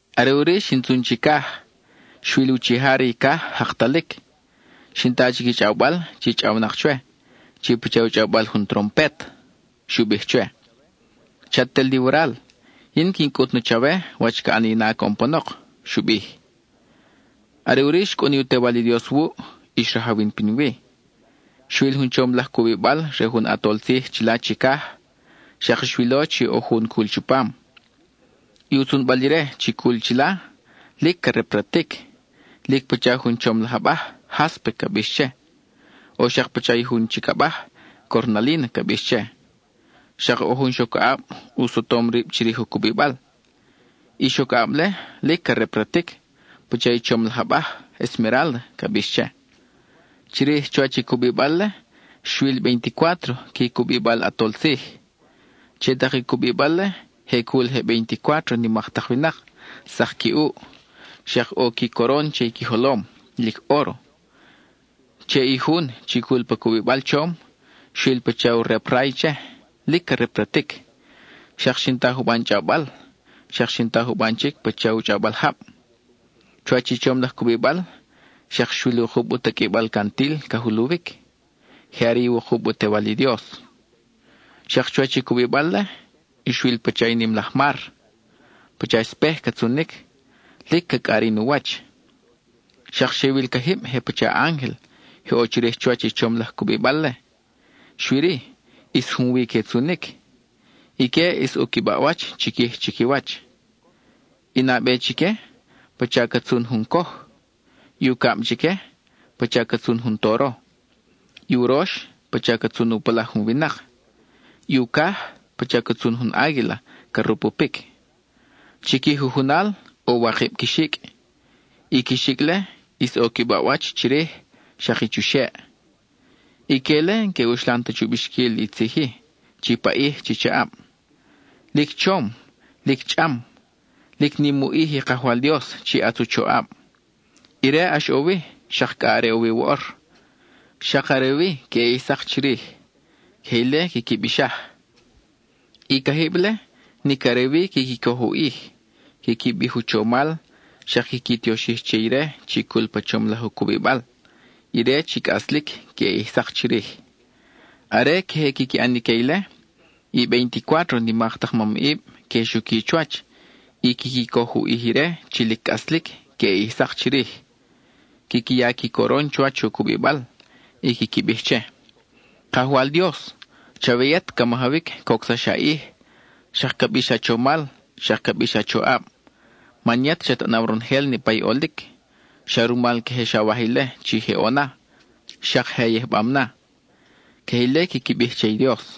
Are ʼuri xin tzun chicaj; xwil uchija re i caj jaktalic. Xin ta chic i chʼawbal chi chʼawnak chwe, chi pacha u chʼawbal jun trompet. Xu bij chwe: —Chat ʼel li waral; yin quin cʼut na chawe wach ca ʼani na coʼon panok —xu bij. Are ʼuri xcʼun i u Tewal i Dios wuʼ, y xrajawin pinwi. Xwil jun chom laj cubibal re jun ʼatol tzij chila chicaj, xak xwilo chi ʼo jun cul chupam. I u tzunbal ire chi cul chila lic ca repratic, lic pacha jun chom laj abaj, jáspe ca bix che, o xak pacha i jun chic abaj, cornalína ca bix che. Xak ʼo jun xocaʼab u sotom rib chirij u cubibal. I xo-caʼab-le lic ca repratic pacha i chom laj abaj, esmerálda ca bix che. Chirij chuwach i cubibal-le, xwil veinticuátro qui cubibal ʼatol tzij. Che tak i cubibal-le, je cul je veinticuátro nimak tak winak, sak qui ʼuʼ, xak ʼo i qui coron che i qui jolom, lic óro. Che i jun chi cul pa cubibal chom, xwil pacha u rep ray che, lic ca repratic, xak xin ta juban chʼawbal, xak xin ta juban chic pacha u chʼawbal jab. Chuwach i chom laj cubibal, xak xwil wukub u taqʼuibal cantil ca juluwic; je are i wukub u tewal i Dios. Xak chuwach i cubibal-le, xwil i pacha nim laj mar; pacha espej ca tzunic, lic ca cʼarin u wach. Xak xe wil cajib je pacha ángel je ʼo chirij chuwach i chom laj cubibal-le, xui-ri, ʼis junwi que tzunic. Ique ʼis ʼo qui baʼwach chiquij chiquiwach; i nabe chique, pacha ca tzun jun coj; i ucab chique, pacha ca tzun jun toro; i urox, pacha ca tzun u palaj jun winak; i ucaj, pacha ca tzun jun águila ca rupupic. Chi qui jujunal, ʼo wakib qui xicʼ; i qui xicʼ-le, ʼis ʼo qui baʼwach chirij, xak i chuxeʼ. Ique-le n-que uxlan ta chu bixquil i tzij-i chi paʼij, chi chaʼab: Lic chom, lic chʼam, lic nim u ʼij i Kajwal Dios chi ʼatz u choʼab. Ire ʼax ʼo wi, xak cʼa are ʼo wi woʼor, xak are wi queʼe ʼij sak chirij. (Queje ile quiqui bixaj.) I cajib-le nic are wi quiqui coj u ʼij, quiqui bij u chomal, xak quiqui tioxij che ire chi cul pa chom laj u cubibal, ire chi cʼaslic queʼe ʼij sak chirij. Are queje quiqui ʼan ique ile, i veinticuátro nimak tak mamʼib que xuqui chuwach y quiqui coj u ʼij ire chi lic cʼaslic queʼe ʼij sak chirij. Quiqui ya i qui coron chuwach u cubibal y quiqui bij che: Kajwal Dios, chawe yet ca majawic coʼsax a ʼij, xak ca bix a chomal, xak ca bix a choʼab. Man yet xat ʼanaw ronojel niʼpa i ʼolic; Xa rumal queje xawaj ile chi je ʼo na, xak je a yijbam na. (Queje ile quiqui bij che i Dios.)